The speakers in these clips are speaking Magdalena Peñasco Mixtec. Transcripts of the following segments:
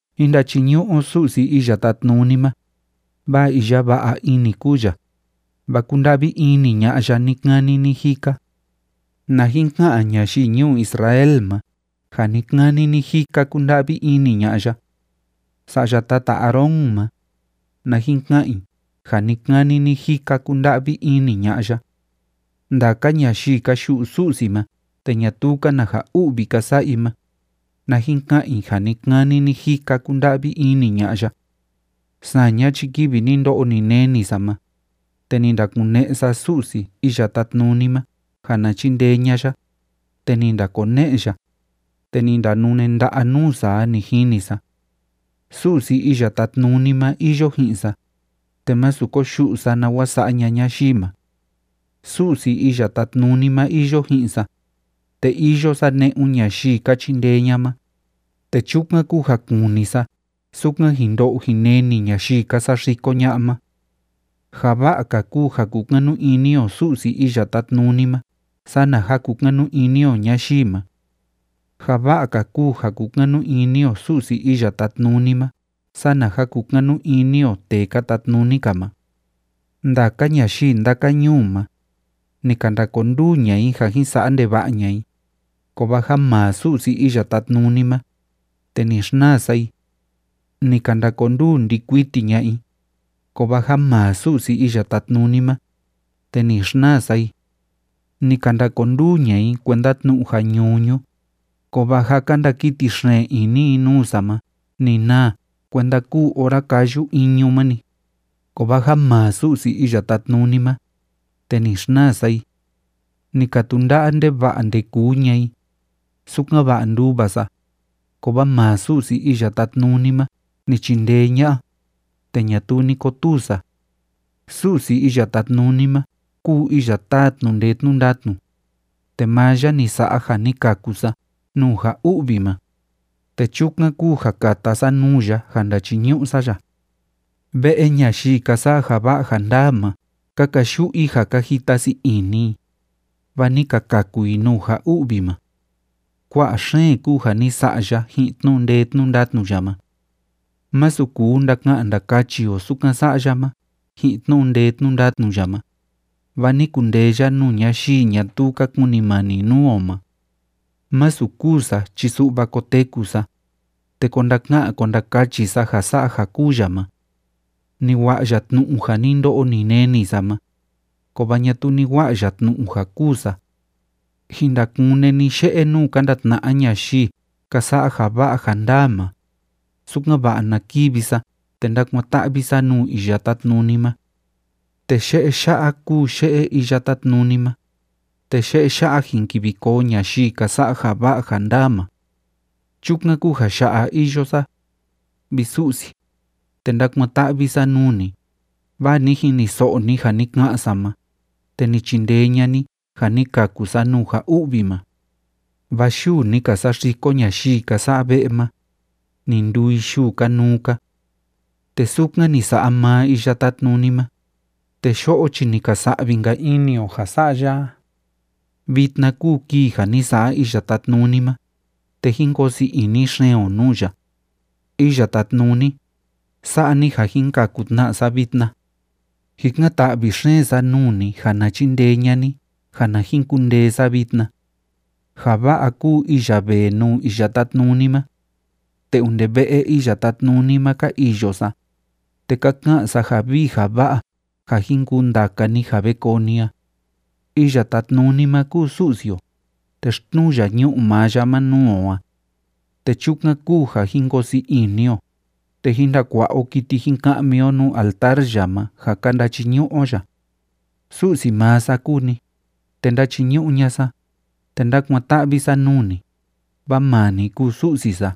Jín ndachiñu'u o Su'si Iya Tátnuni ma, vaa iya va'a ini kúu ya, vaa kúnda'vi ini ña'a ya ni‑kani ni‑jika. Na jin ka'an ñayii ñuu Israel ma ja ni‑kani ni‑jika kúnda'vi ini ña'a ya. Sa'ya tata Aarón ma, na jin ka'an i ja ni‑kani ni‑jika kúnda'vi ini ña'a ya. Ndaka ñayii ka yu'u Su'si ma te ñatuu‑ka na ja u'vi ka sa'a i ma, na jin ka'an i ja ni‑kani ni‑jika kúnda'vi ini ña'a ya. Saña chi kivi ni ndo'o ni neni sa ma, te ni ndakune'e sa Su'si Iya Tátnuni ma ja na chindee ña'a ya, te ni ndakone'e ya, te ni ndanune nda'a nuu sa a, ni jini sa. Su'si Iya Tátnuni ma iyo ji'in sa, te másu koyu'u sa nawa sa'a ña'a ñayii ma. Su'si Iya Tátnuni ma iyo ji'in sa, te iyo sa ne'un ñayii ka chindee ña'a ma, te chukan kúu ja kuni sa sukan jin ndo'o jin neni ñayii ka saxiko ña'a ma. Ja va'a‑ka kúu ja kukanu ini o Su'si Iya Tátnuni ma sana ja kukanu ini o ñayii ma. Ja va'a‑ka kúu ja kukanu ini o Su'si Iya Tátnuni ma sana ja kukanu ini o tee ka tatnuni‑ka ma. Ndaka ñayii ndaka ñuu ma, ni ka ndakonduu ña'a i ja jin sa'a ndeva'a ña'a i, kovaa ja maa Su'si Iya Tátnuni ma, te ni xnaa sa i. Ni ka ndakonduu ndi'i kuiti ña'a i, kovaa ja maa Su'si Iya Tátnuni ma, te ni xnaa sa i. Ni ka ndakonduu ña'a i kuenda tnu'u ja ñuñu, kovaa ja ka ndakiti xeen ini i nuu sa ma ni naa kuenda kúu ora káyu iñu ma‑ni, kovaa ja maa Su'si Iya Tátnuni ma, te ni xnaa sa i. Ni ka tunda'a ndeva'a ndekuu ña'a i, sukan‑va'a nduva sa, kovaa maa Su'si Iya Tátnuni ma ni chindee ña'a, te ñatuu ni kotuu sa. Su'si Iya Tátnuni ma kúu iya táa tnu'u ndee tnu'u ndatnu, te maa ya ni sa'a ja ni kaku sa nuu ja u'vi ma, te chukan kúu ja kata sa nuu ya ja ndachiñu'u sa ya. Ve'e ñayii ka sa'a ja va'a ja ndaa ma ka kayu'u i, ja ka jita sii ini i, vaa ni ka kaku i nuu ja u'vi ma. Kua'a xeen kúu ja ni sa'a ya ji'in tnu'u ndee tnu'u ndatnu ya ma. Masu kuu ndaka'an ndakachi o sukan sa'a ya ma ji'in tnu'u ndee tnu'u ndatnu ya ma, vaa ni kundee ya nuu ñayii ñatuu ka kunimani nuu o ma. Masu kûu sa chi su'va koteku sa, te ko ndaka'an ko ndakachi sa ja sa'a ja kúu ya ma. Ni wa'a ya tnu'u ja ni ndo'o ni neni sa ma, kovaa ñatuu ni wa'a ya tnu'u ja kûu sa. Jin ndakune ni ye'e nuu ka ndatna'a ñayii ka sa'a ja va'a ja ndaa ma, sukan‑va'a na kivi sa te ndákuan‑ta'vi sa nuu Iya Tátnuni ma. Te ye'e ya'a kúu ye'e Iya Tátnuni ma, te ye'e ya'a jin kivi koo ñayii ka sa'a ja va'a ja ndaa ma. Chukan kúu ja ya'a iyo sa, vi Su'si, te ndákuan‑ta'vi sa nuu ni, vaa ni jiniso'o ni ja ni ka'an sa ma, te ni chindee ña'a ni ja ni kaku sa nuu ja u'vi ma. Vaa yuu ni ka saxiko ñayii ka sa'a ve'e ma, ni nduu i yuu kanuu‑ka. Te sukan ni sa'a maa Iya Tátnuni ma, te yo'o chi ni ka sa'vi‑nka ini o ja sa'a ya a. Vitna kúu kii ja ni sa'a Iya Tátnuni ma, te jín koo sii ini xeen o nuu ya. Iya Tátnuni, sa'a ni ja jin kaku tna sa vitna. Jikan‑ta'vi xeen sa nuu ni ja na chindee ña'a ni ja na jin kundee sa vitna. Ja va'a kúu iya vee nuu Iya Tátnuni ma. Te onde ve'e Iya Tátnuni ma ka iyo sa, te ka ka'an sa ja vii ja va'a ja jin kuu ndaka ni ja ve koo ni a. Iya Tátnuni ma kúu Su'si o, te xtnuu ya ñu'u maa ya ma nuu o a. Te chukan kúu ja jín koo sii ini o, te jín ndakua'a o kiti jin ka'mi o nuu altar ya ma ja ka ndachiñu'u o ya. Su'si maa sa kúu ni, te ndáchiñu'u ña'a sa, te ndákuan‑ta'vi sa nuu ni, vaa maa ni kúu Su'si sa.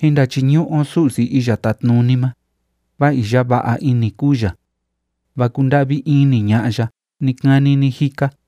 Jín ndachiñu'u o Su'si Iya Tátnuni ma, vaa iya va'a ini kúu ya, vaa kúnda'vi ini ña'a ya ni‑kani ni‑jika.